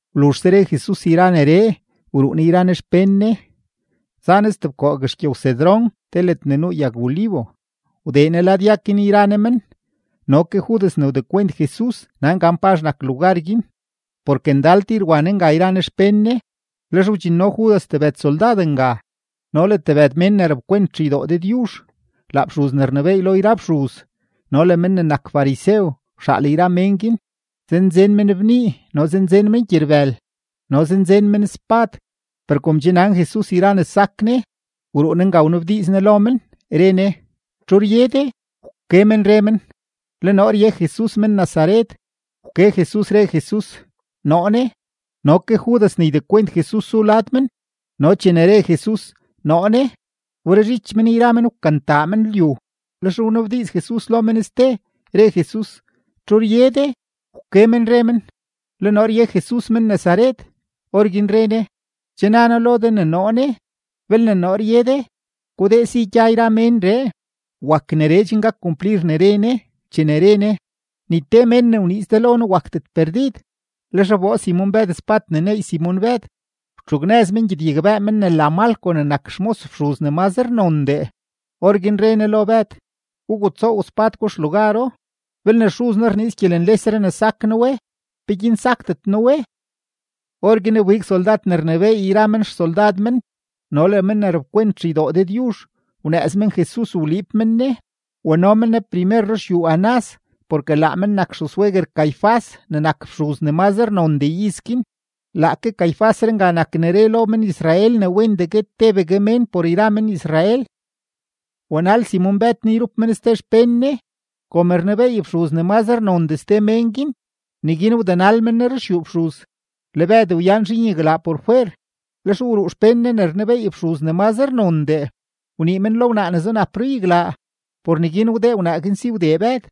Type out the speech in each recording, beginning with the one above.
Wluzhse re Jesus yra neree, wruu Ne yra Ne xpén Ne, za Ne stebkoo guexgyow-Cedrón te ledne nuu yag-olivo, wdee Ne lad yag guin yra Ne men. No ke Judas ne wdekwent Jesus nan gan pazh nak lugar guin, porke ndal tir wa Ne nga yra Ne xpén Ne. Lex wdxinno Judas tebëd soldad nga no le tebëd mén ne rapkwent xeydoo Dëdyuzh; laa fxuz ne rnebééy lo yra fxuz no le men ne nak farisew wxaal yra men guin. Zanzen men bnii, no zanzen men gyerbël, no zanzen men spad. Per kom che nan Jesus yra ne sak Ne, wruu Ne nga wnabdiiz Ne lo men, re Ne: ―¿Txu rye de? Wke men re men: ―Le noo rye Jesus men-Nazaret. Wke Jesus, re Jesus: ―Noo ne. No ke Judas ne ydekwent Jesus zu lad men. No chene re Jesus: “Noo ne”, wberezhich men yra men wkantaa men lyu. Lex wnabdiiz Jesus lo men ste, re Jesus: ―¿Txu rye de? Wke men re men: ―Le noo rye Jesus men-Nazaret. Orguin re Ne: ―Che na noo lo de ne noo ne. Belne noo rye de, gudee si gya yra ménree. Wak neree chen gak kumplir ne re Ne, chene re Ne: “Ni te mén ne wniiz de lo noo wakdet perdid.” Lex wboo Simon-Bëd spad ne neey Simon-Bëd, wtxugnëz men gyedyagbëë men ne la Malco ne nak xmos fxuz ne mazre nondee. Orguin re Ne lo Bëd: ―Gugutsoow spad gwa xlugaro. Belne Xuz noo rniiz gyelenlesree ne sak noo we, ¿peguin sakdet noo we? Orguin wbig soldad ne rnebééy yra men xsoldad men no le men ne rapkwent xeydoo Dëdyuzh, wnëëz men Jesus wliib men Ne. Wano men Ne primer ruxyuu Anás porke laa men nak xuzsweguer Caifás ne nak fxuz ne mazre nondee iz guin. Laake Caifásree nga nak ne re lo men-Israel ne wendee guet tebegue mén por yra men-Israel. Wanal Simon-Bëd Jesus yrup men ste xpén Ne. Kom rnebeey fxuz ne mazre nondee ste men guin, neguin wdenal men Ne ruxyuu fxuz, le Bëd wyan zhiin yaglaa por fwer. Lex wruu xpén Ne ne rnebeey fxuz ne mazre nondee, wnii men lo wnaa ne zunap ruyaglaa; por neguin wdee wnaa guin si wdee Bëd.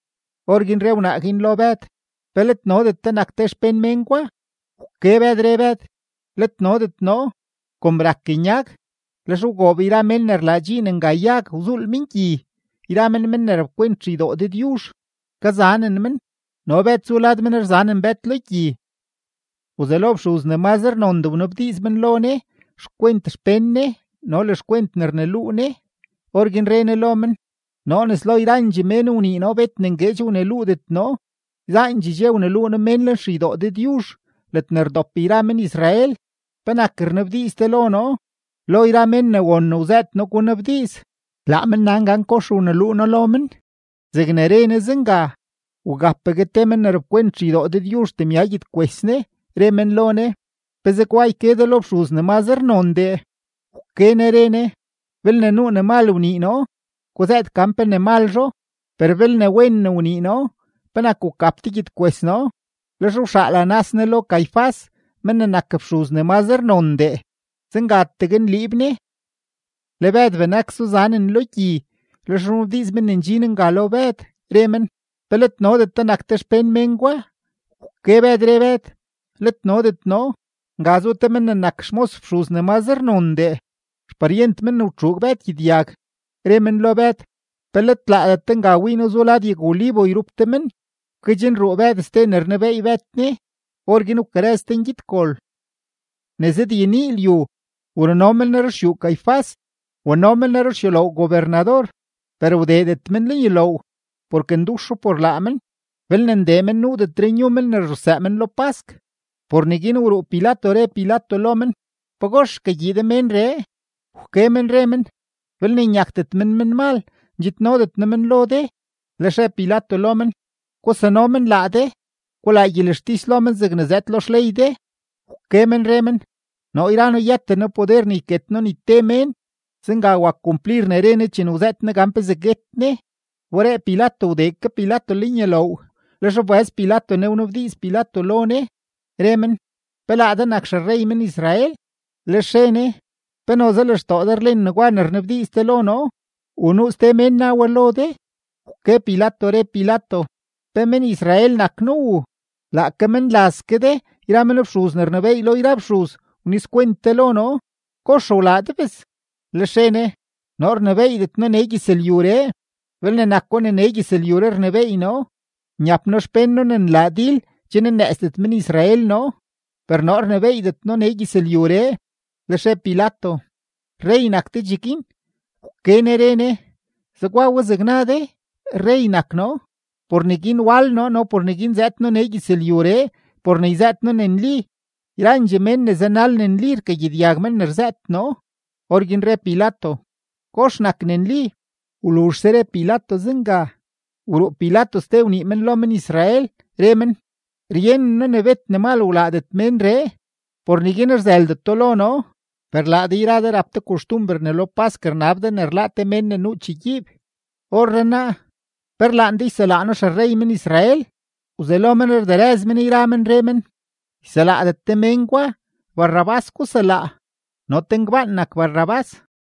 Orguin re wnaa guin lo Bëd: ―¿Pe let nodet de nak te xpén mén gwa? Wke Bëd, re Bëd: ―Let nodet noo. Kom rak nyag, lex wgoob yra mén ne rlaa dxiin nga yag, wzuul men gyi, yra men men ne rapkwent xeydoo Dëdyuzh, kazanen men. No Bëd zu lad men rzanen Bëd lo gyi. Wzelo fxuz ne mazre nondee wnabdiiz men lo Jesus xkwent xpén Ne no le xkwent ne rneluu Ne. Orguin re Ne lo men: ―Noo nes lo yrandxee mén wnii noo, bet ne ngueedx wneluudet noo; yzaandxee dxe wneluu noo mén lenxeydoo Dëdyuzh ledne rdop yra men-Israel. ¿Penak rnabdiiz de lo noo? Lo yra mén ne won ne wzëët noo gunabdiiz; laa men nan gan kox wneluu noo lo men. Zegne re Ne zenga, wgapgue te ke men ne rapkwent xeydoo Dëdyuzh temya gyedkwes Ne, re men lo Ne: ―¿Pe zegwa yke de lo fxuz ne mazre nondee? Wke Ne re Ne: ―Belne nuu ne mal wnii noo, guzëët gan pe ne malzho; per belne wen ne wnii noo, ¿penak wgap de gyedkwes noo? Lex wxaal Anás Ne lo Caifás men ne nak fxuz ne mazre nondee, zengategue nliib Ne. Le Bëd benak zuzanen lo gyi. Lex wnabdiiz men ne ndxin nga lo Bëd, re men: ―¿Pe let nodet de nak te xpén mén gwa? Wke Bëd, re Bëd: ―Let nodet noo. Nga zu te men ne nak xmos fxuz ne mazre nondee, xparyent men ne wtxuug Bëd gyedyag, re men lo Bëd: ―¿Pe let laadet de nga wii noo zu lad yag-olivo yrup de men? Wkedxnruu Bëd ste ne rnebeey Bëd Jesus; orguin wkarëz te ngyedgol. Ne zëdyenii lyu, wruno men Jesus ruxyuu Caifás, wano men Ne ruxyuloow gobernador, per wdeedet men lenyuloow, porke nduxo por laa men. Belne ndee men, nuudetre nyu men ne ruxsëë men lo pask. Por neguin wruu Pilato re Pilato lo men: ―¿Pagox rkagyii de ménree? Wke men re men: ―Belne nyakdet men menmal, ndxidnodet noo men lo de. Lex re Pilato lo men: ―Gusano men laa de, gulaa gyelextis lo men zegne zëëd lo xley de. Wke men re men: ―Noo yra noo yëten noo poder ne yket noo ni te mén. Zenga wak kumplir ne re Ne chene wzëët Ne gan pezee guet Ne. Wberee Pilato wdee ke Pilato lenyuloow, lex wbëz Pilato Ne wnabdiiz men lo Ne, re men: ―¿Pe laa de nak xerrey men-Israel? Lex re Ne: ―¿Pe noze lextoo de rlen negwa ne rnabdiiz de lo noo, u nuu ste mén na we lo de? Wke Pilato, re Pilato: ―¿Pe men-Israel nak noo u? Laake menlaz ke de yra men fxuz ne rnebééy lo yra fxuz wnizkwent de lo noo. ¿Kox wlaa de bes? Lex re Ne: ―Noo rnebééydet noo nee gyëzlyuree. Belne nako ne nee gyëzlyuree rnebééy noo, nyap noo xpén noo ne nlaa dil, chen nnëëzdet men-Israel noo. Per noo rnebééydet noo nee gyëzlyuree. Lex re Pilato: ―¿Rrey nak de cheguin? Wke Ne re Ne: ―Zegwa we zeg na de, rrey nak noo. Por neguin wal noo no por neguin zëëd noo nee gyëzlyuree por ne yzëët noo ne nli. Yrandxee mén ne zanal ne nli, rkagyedyag men ne rzëët noo. Orguin re Pilato: ―¿Kox nak ne nli? Wluzhse re Pilato zenga, wruu Pilato ste wnii men lo men-Israel, re men: ―Ryenen noo ne bet ne mal wlaadet ménree, por neguin rzëldeto lo noo. Per laa de yra de rap de koxtumber ne lo pask rnab de ne rláá te mén ne nuu chegyiib. Orrenaa, ¿pe rlaan de yselaa noo xerrey men-Israel? Wzelo men rderëz men yra men, re men: ―¡Yselaadet de men gwa! ¡Barrabás guselaa! No te ngbaan nak Barrabás.